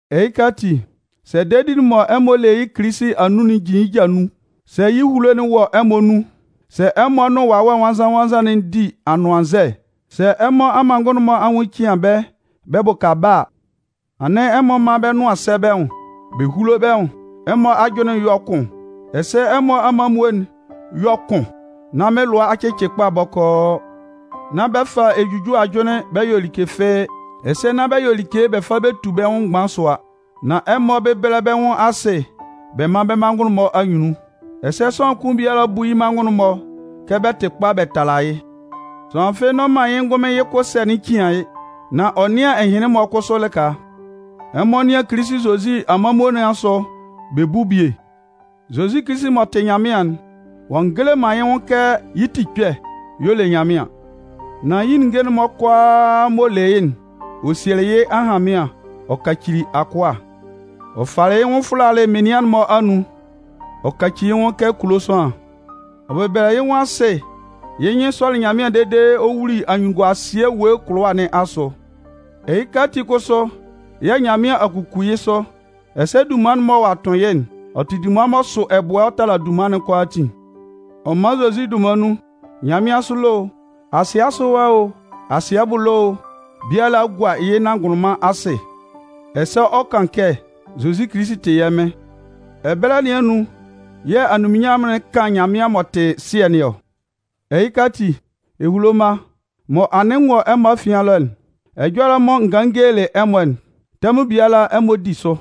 Ɛhɩka ati, sɛ dedi'n mɔ ɛmɔ le yɩ́ Kilisi anun'n jin yɩ́ ja nun, sɛ yɩ́ ehulo'n wɔ ɛmɔ anun, sɛ ɛmɔ nʋn Wawɛ Nwannzan-nwannzan'n di anʋannzɛ, sɛ ɛmɔ amanngʋn'n-mɔ anwʋn cian bɛ́ bɛ bʋka bɛ́ a, anɩn ɛmɔ mán bɛ́ nʋan sɛ́ bɛ́ nwʋn, bɛ húlo bɛ́ nwʋn, ɛmɔ ajʋnlɩn yɔ́ kʋn, ɛsɛ ɛmɔ amanmuo'n yɔ́ kʋn nán mɩ́n lʋa a cɩcɩ kpa bɔkɔɔ. Nán bɛ fa ejujue ajʋnlɩn bɛ yɔ like fɩ́ɩ́, ɛsɛ nán bɛ yɔ like bɛ fa bɛ tu bɛ́ nwʋn mgban sʋa. Nan ɛmɔ bɛ́bɛlɛ bɛ́ nwʋn asɩ bɛ́ manngʋn'n-mɔ anyunnun, ɛsɛ sʋanlan kʋn biala bú yɩ́ manngʋn'n-mɔ kɛ bɛ tɩ kpa bɛ tala yɩ́. Sʋanlan fɩ́ɩ́ n'ɔ man yɩ́ ngʋnmɩn yɩ́ kʋ ɛsɛ̂'n cian yɩ́, nán ɔ nɩ́an ɛhɩnlɩn-mɔ kʋsʋ lɩka. Ɛmɔ nɩ́an Kilisi Zozi amanmuo nɩn asʋ bɛ bú bie. Zozi Kilisi m'ɔ tɩ Nyanmɩan'n, ɔ'a ngele man yɩ́ nwʋn kɛ yɩ́ tikpɛ y'ɔ le Nyanmɩan. Nan yɩ́ ninnge'n-mɔ kʋalaa m'ɔ le yɩ́'n, ɔ sielɩ yɩ́ ahanmɩan ɔ kacili akʋa. Ɔ falɩ yɩ́ nwʋn fʋlalɩ menian'n-mɔ anun, ɔ kaci yɩ́ nwʋn kɛ kulo sʋanlan. Ɔ bɛbɛlɛlɩ yɩ́ nwʋn asɩ yɩ́ nyɩn sɔlɩ Nyanmɩan dede ɔ wuli anyunnunguasɩɛ ewue kʋlʋwa nɩn asʋ. Ɛhɩka ati kʋsʋ yɛ̂ Nyanmɩan a kuku yɩ́ sʋ, ɛsɛ dunman'n mɔ ɔ'a tʋn yɩ́'n, ɔ tɩ dunman m'ɔ sʋ ɛbʋɛ ɔ tala dunman'n kʋalaatin. Ɔ man Zozi dunman nun, nyanmɩansʋ ɛlɔ o, asɩɛ asʋ ɛwa o, asɩɛ bʋ ɛlɔ o, biala 'gua yɩ́ nanngʋnlʋnman asɩ ɛsɛ ɔ 'kan kɛ Zozi Kilisi tɩ yɛ́ Mɩn. Ɛbɛlɛ nɩn anun yɛ̂ anunminnyanmʋn 'kan Nyanmɩan m'ɔ tɩ Sɩɛ nɩn ɔ. Ɛhɩka ati, ehulo mma, mɔ anɩn n wɔ ɛmɔ afian ɛlɔ'n, ɛjɔlɛ'n mɔ n ganlɩn n gelelɩ ɛmɔ'n, tɛmʋn biala ɛmɔ di sʋ.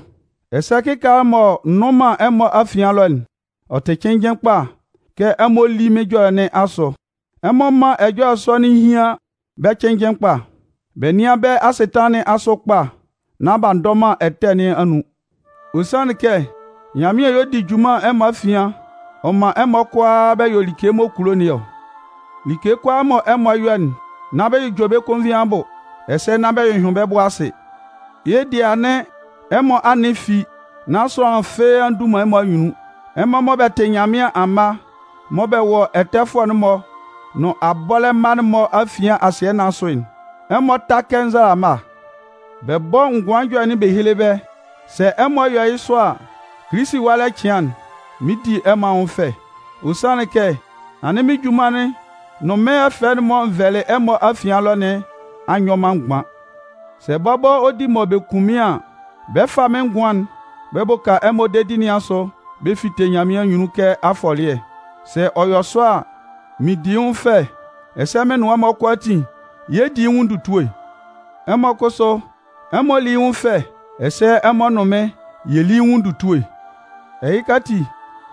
Ɛsɛ kɩkaala mɔ n nnʋn man ɛmɔ afian ɛlɔ'n, ɔ tɩ cɩnnjɩn kpa kɛ ɛmɔ lí mɩ́n ɛjɔlɛ nɩn asʋ. Ɛmɔ mán ɛjɔlɛ sɔ'n hían bɛ́ cɩnnjɩn kpa, bɛ nɩ́an bɛ́ asɩtanlan nɩn asʋ kpa nán b'a ndɔ man ɛtɛ nɩn anun. Ɔ sanlɩn kɛ Nyanmɩan y'ɔ di junman ɛmɔ afian ɔ man ɛmɔ kʋala bɛ yɔ like m'ɔ kulo nɩn ɔ. Like kʋalaa mɔ ɛmɔ 'yɔ'n, nán bɛ jʋjɔ bɛ́ konvin abʋ, ɛsɛ nán bɛ hyʋhyʋɩn bɛ́ bʋ asɩ. Yɩ́ dɩɛ anɩn ɛmɔ anɩn fi nán sʋanlan fɩ́ɩ́ a ndu man ɛmɔ anyunnun. Ɛmɔ mɔ bɛ tɩ Nyanmɩan amma mɔ bɛ wɔ ɛtɛfʋɛ'n-mɔ nʋn abɔlɛ mma'n-mɔ afian asɩɛ nɩn asʋ'n, ɛmɔ tá kɛ nzalama bɛ bɔ́ ngʋan ɛjɔlɛ'n bɛ héle bɛ́. Sɛ ɛmɔ yɔ yɩ́ sɔ a, Kilisi ɛwalɛ cɩan'n, mɩn 'di ɛmɔ anwʋn fɛ. Ɔ sanlɩn kɛ anɩn mɩ́n junman'n nʋn mɩ́n ɛfɛ mɔ n vɛlɩ ɛmɔ afian ɛlɔ nɩn a nyɔ man mgban. Sɛ bɔbɔ ɔ di mɔ bɛ kun mɩ́n an, bɛ 'fa mɩ́n ngʋan'n bɛ bʋka ɛmɔ dedi nɩn asʋ bɛ fite Nyanmɩan anyunnun kɛ afɔlɩɛ. Sɛ ɔ yɔ sɔ a, mɩn di yɩ́ nwʋn fɛ ɛsɛ mɩn nʋn ɛmɔ kʋalaatin yɛ 'di yɩ́ nwʋn ndutue. Ɛmɔ kʋsʋ, ɛmɔ lí yɩ́ nwʋn fɛ ɛsɛ ɛmɔ nʋn mɩ́n yɛ lí yɩ́ nwʋn ndutue. Ɛhɩka ati,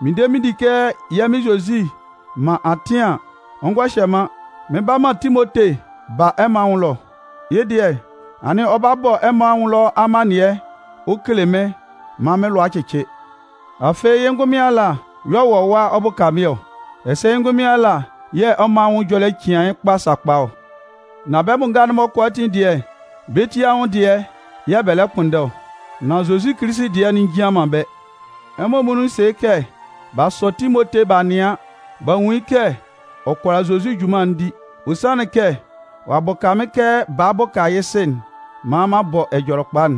mɩn de mɩn di kɛ yɛ́ Mɩn Zozi man atɩn an, ɔ ngɔ hyɛ man, mɩn 'ba man Timote ba ɛmɔ anwʋn ɛlɔ. Yɩ́ dɩɛ, anɩn ɔ ba ɔ bɔ ɛmɔ anwʋn ɛlɔ amannɩɛ ɔ kele mɩ́n maan mɩ́n lʋa cɩcɩ. Afɩ yɩ́ ngʋnmɩn ala y'ɔ wɔ ɛwa ɔ bʋka mɩ́n ɔ. Ɛsɛ yɩ́ ngʋnmɩn ala yɛ̂ ɛmɔ anwʋn ɛjɔlɛ cian yɩ́ kpa sakpa ɔ. Nan bɛ́ bʋ nga'n-mɔ kʋalaatin dɩɛ, bɛ́ ti anwʋn dɩɛ yɛ̂ bɛ lɛ kpʋnndɛ ɔ, nan Zozi Kilisi dɩɛ'n njian man bɛ́. Ɛmɔ muonun sɩ kɛ b'a sɔ Timote b'a nɩan b'a nwun yɩ́ kɛ ɔ kʋala Zozi junman'n di. Ɔ sanlɩn kɛ ɔ'a bʋka mɩ́n kɛ baa bʋka yɩ́ sɩ'n maan m'an bɔ Ɛjɔlɛkpa'n.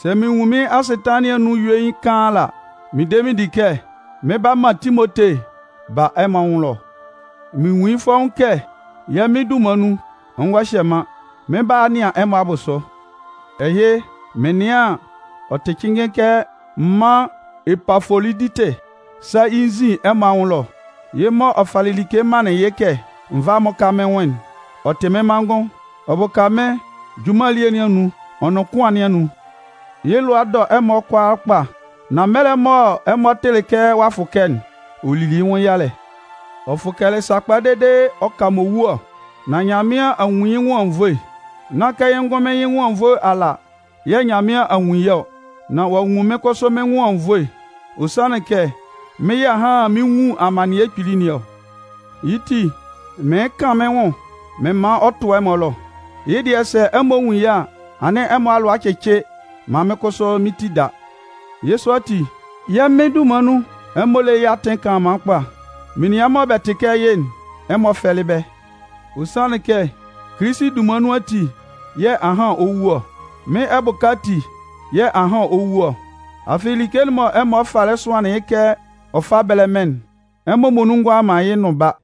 Sɛ mɩn nwun mɩ́n asɩtanlan nɩn anun yuein kaan ala, mɩn de mɩn di kɛ mɩn 'ba man Timote ba ɛmɔ anwʋn ɛlɔ. Mɩn nwun yɩ́ fɔ́ʋ́n kɛ yɛ́ Mɩn dunman nun, ɔ ngɔ hyɛ man, mɩn 'ba a nɩan ɛmɔ abʋsʋ. Ɛhɩ, mɩn nɩan an, ɔ tɩ cɩnnjɩn kɛ m mán Epafoloditɩ sá yɩ́ nzin ɛmɔ anwʋn ɛlɔ. Yɩ́ mɔ ɛmɔ falɩ like manlɩn yɩ́ kɛ n vá m mʋ́ka mɩ́n nwʋn'n, ɔ tɩ mɩ́n manngʋn. Ɔ bʋka mɩ́n junman elie nɩn anun ɔ nʋn kʋan nɩn anun. Yɩ́ lʋa dɔ ɛmɔ kʋalaa kpa. Nan mɛlɛ mɔ ɛmɔ tɩlɩ kɛ ɔ'a fʋkɛ'n, ɔ lili yɩ́ nwʋn yalɛ. Ɔ fʋkɛlɩ sakpa dede ɔ ka m'ɔ wu ɔ. Nan Nyanmɩan a nwun yɩ́ nwʋn anwunnvoe. Nán kɛ yɩ́ ngʋnmɩn yɩ́ nwʋn anwunnvoe ala yɛ̂ Nyanmɩan a nwun yɩ́ ɔ, nan ɔ'a nwun mɩ́n kʋsʋ mɩ́n nwʋn anwunnvoe. Ɔ sanlɩn kɛ mɩ́n yɛ̂ ahan mɩn 'nwun amannɩɛ kpili nɩn ɔ. Yɩ́ ti, mɩɩn kan mɩ́n nwʋn mɩn man ɔ tʋ ɛmɔ ɛlɔ. Yɩ́ dɩɛ, sɛ ɛmɔ nwun yɩ́ a, anɩn ɛmɔ alʋa cɩcɩ maan mɩ́n kʋsʋ mɩ́n ti da. Yɩ́ sɔ ati, yɛ́ Mɩn dunman nun, ɛmɔ lé yɩ́ atɩn kanlanman kpa. Menian mɔ bɛ tɩ kɛ yɩ́'n, ɛmɔ fɛ́lɩ bɛ́. Ɔ sanlɩn kɛ Kilisi dunman nun ati yɛ̂ ahan ɔ 'wu ɔ. Mɩ́n ɛbʋka ati yɛ̂ ahan ɔ 'wu ɔ, afɩ, like'n mɔ ɛmɔ falɩ sʋanlan yɩ́ kɛ ɔ fá bɛ́lɛ mɩ́n'n, ɛmɔ muonun ngʋala man yɩ́ nʋn ba.